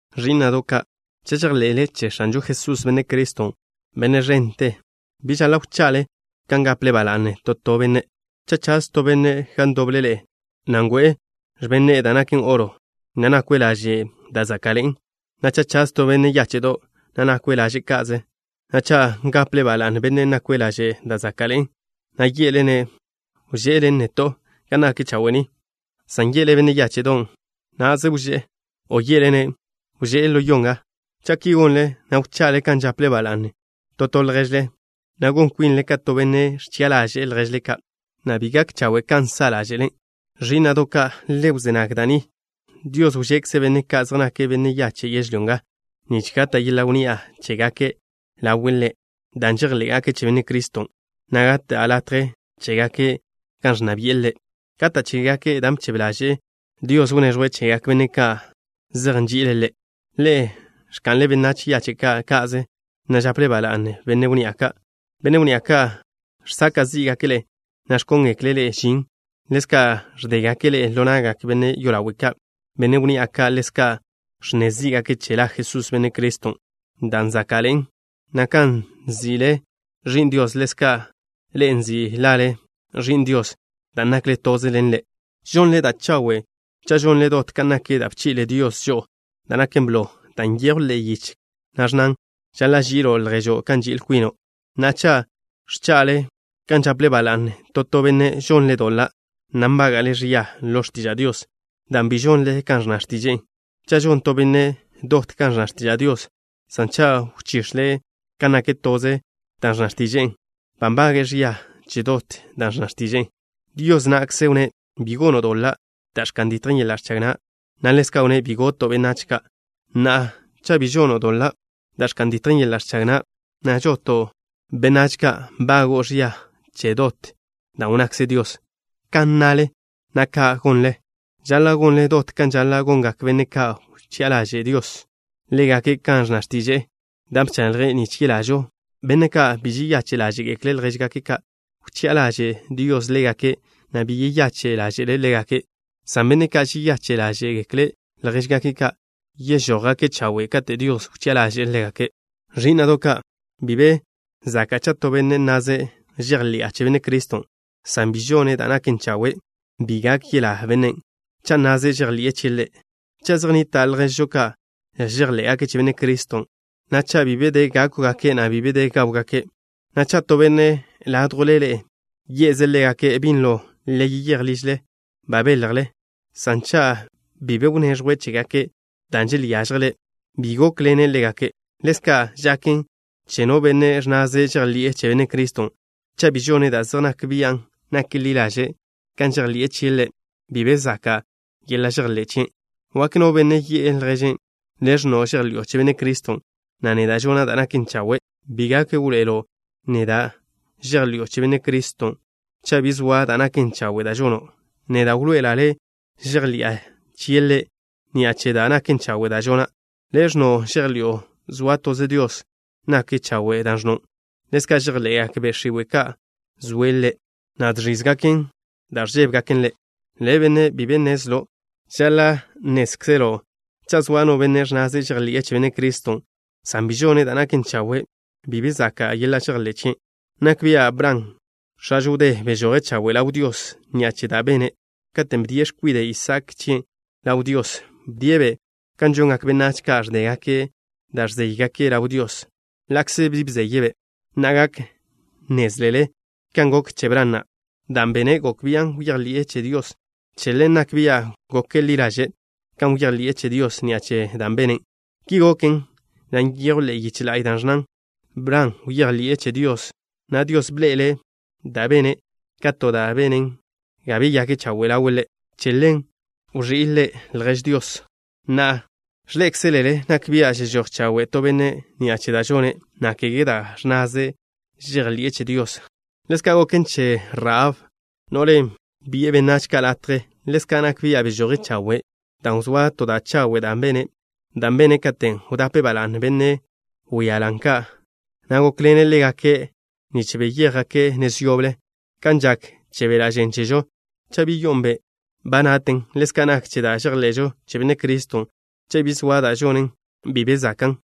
Ẕí'na'do' ka', cha' žejḻe'le che X̱anžo Jesús, Benne' Criston', Benne' ẕente, bi žaḻa' wcha'le kan gaple ba la'ne to to benne'. Cha' chaz to benne' gan ndoble ḻe'e, na' ngo'e x̱ben ne'e da' naken oro, na' nakwe' laže' da' záka'ḻe'en, na' cha' chaz yetó benne' yáche'do', na' nakwe' laže' ka'ze, na' cha' gaple ba la'ne bennen' nakwe' laže' da' záka'ḻe'en, na' ye'le-ne': “Wže'ḻen neto' ga nak chawe' ni” san ye'le benne' yáche'don': “Na'ze wzé” o ye'le-ne': “Wžé' ḻo yo nga.” Cha' ki gonle, na' wcha'le kan žaple ba la'ne to to lježle, na' gon kwinle ka to benne' ẕchi'a ḻaže'e lježe' ka', na' bi gak chawe' kan sa' ḻáže'le. Ẕí'na'do' ka', le wzé nag da' ni. Dios wžekze' benne' ka' zej nake' yache' yežlyó nga, nich gata' yeḻa' wnni'a chégake' ḻawe' Ḻe' dan' žejḻé'gake' che Benne' Criston', na' gata' latje chégake' gan ẕnna bi'e Ḻe'. Gata' chégake' dan' bchebe ḻaže' Dios wneẕjwe' chegak benne' ka' zej nži'ile' Ḻe'. Ḻe'e ẕka'nle benách yache' ka' ka'ze, na' žaple ba la'ne benne' wnni'a ka'. Benne' wnni'a ka' žsaka' zí'gake' ḻe'e, na' ẕkóngekle' ḻe'e žin. Ḻezka' ẕdégake' ḻe'e ḻo na'gak benne' yolawe' ka'. Benne' wnni'a ka' ḻezka' ẕnne zí'gake' che la Jesús, Benne' Criston', dan' záka'ḻe'en, na' kan nzi' le' Ẕi'n Dios ḻezka' ḻe'e nzi' lale ẕi'n Dios dan' nakle toze ḻen Ḻe'. Žonle da' chawe' cha' žonle dot kan nak da' bchi'le Dios žo'o da' naken blo, dan' nyejwn ḻe'e yiche, na' ẕnnan: “Žaḻa' ži'ilo' lježo' kan nži'il kwino'.” Na'a, cha' ẕcha'le kan žaple ba la'ne to to benne', žonle doḻa', na' nbága'le ẕia ḻo x̱tiža' Dios, dan' bi žonle kan ẕnna x̱tiže'e. Cha' žon to benne' dot kan ẕnna x̱tiža' Dios, san cha' wchix̱le' kan nak toze da' ẕnna x̱tiže'e, ba nbage'e ẕia che dot da' ẕnna x̱tiže'e. Dios na'kze wnné': “Bi gono' doḻa' da' ẕka'n ditjen yeḻa' ẕchag na'” na' ḻezka' wnné': “Bi goto' benách ka'.” Na'a, cha' bi žono' doḻa' da' ẕka'n ditjen yeḻa' ẕchag na', san žoto' benách ka', nbago'o ẕia che dot da' wnnakze Dios. Kan nnale, na' kan gonle, žaḻa' gonle dot kan žaḻa' gongak benne' ka' wchi'a ḻaže' Dios ḻégake' kan ẕnna x̱tiže'e, da' bchaḻje' nich yelažo. Benne' ka' bi žeyache' ḻáže'gekle' ljéžgake' ka', wchi'a ḻaže' Dios ḻégake', na' bi yeyache' ḻáže'le' ḻégake', san benne' ka' žeyache' ḻáže'gekle' ljéžgake' ka' yežójgake' chawe' kate' Dios wchi'a ḻaže'e ḻégake'. Ẕí'na'do' ka', bi be zaka' cha' to benne' nnaze': “Žejḻi'a che Benne' Criston'” san bi žone' da' naken chawe'. Bi gak yelá bennen' cha' nnaze' žejḻi'e chie' Ḻe'. Cha' zej nnita' lježžo ka' žejḻé'gake' che Benne' Criston', na' cha' bi de da' gákwgake', na' bi de da' gáwgake', na' cha' to benne' ládjwle ḻe'e ye'ze' ḻégake': “Binlo le yeyéj ližle; ba beljle” san cha' bi be wneẕjwe' chégake' dan' želyážjele', bi gókḻene' ḻégake'. Ḻezka' žaken che no benne' ẕnnaze' žejḻi'e che Benne' Criston'. Cha' bi žone' da' zej nak bian' nak ḻi ḻaže' kan žejḻi'e chie' Ḻe', bi be zaka' yeḻa' žejḻé' chien'. Wak no benne' yi'e lježe': “Le' ẕnno' žejḻi'o che Benne' Criston', na' neda' žona' da' naken chawe'. Bi gak wḻoe'elo' neda' žejḻi'o che Benne' Criston' cha' bi zoa da' naken chawe' da' žono'. Neda' wḻoe'ela' le' žejḻi'a chie' Ḻe' ni'a che da' naken chawe' da' žona'.” Le' ẕnno' žejḻi'o zoa toze Dios. Nak chawe' dan' ẕnno'. Ḻezka' žejḻe'gak be' x̱iwe' ka' zoe' Ḻe', na' žẕízegaken dan' ẕžébegaken Ḻe'. Le', benne' bi be nnezlo'. Žaḻa' nnézkzelo' cha' zoa no benne' ẕnnaze' žejḻi'e che Benne' Criston', san bi žone' da' naken chawe', bi be zaka' yeḻa' žejḻé' chien'. Nak bia' Bran, x̱ažo wdé, bežoje' chawe' ḻaw Dios ni'a che da' bene', katen' bdie' x̱kwide' Isaak chien' ḻaw Dios. Bdie'-be' kan žongak benách ka' ẕdégake' da' ẕzéygake' ḻaw Dios, ḻa'kze bi bzeye'-be'. Na'a gak nnézlele kan goken che Bran na'. Dan' bene' gok bian' bejḻi'e che Dios. Che ḻen nak bia' gok ḻi ḻaže' kan bejḻi'e che Dios ni'a che dan' bene'. Ki goken, na' nyejw ḻe'e yiche la'y da' ẕnnan: “Bran bejḻi'e che Dios, na' Dios bḻe'ele' da' bene' ka to da' benen ga beyake' chawe' ḻawe' Ḻe'.” Che ḻen wẕí' le' “Ljež Dios.” Na'a, ẕḻé'ekzelele nak bia' žežój chawe' to benne' ni'a che da' žone', na' kege dan' ẕnnaze' žejḻi'e che Dios. Ḻezka' goken che Rahab, no'len' bi'e benách ka' latje. Ḻezka' nak bia' bežoje' chawe' dan' wzóa to da' chawe' da' bene', dan' bene' katen' wdape' ba la'ne benne' wíalan ka', na' gókḻene' ḻégake' nich beyéjgake' nez yoble. Kan žak che beḻa' žen chežo cha' bi yo'on be', ba naten, ḻezka' nak che da' žejḻe'žo che Benne' Criston' cha' bi zoa da' žonen, bi be zakan'.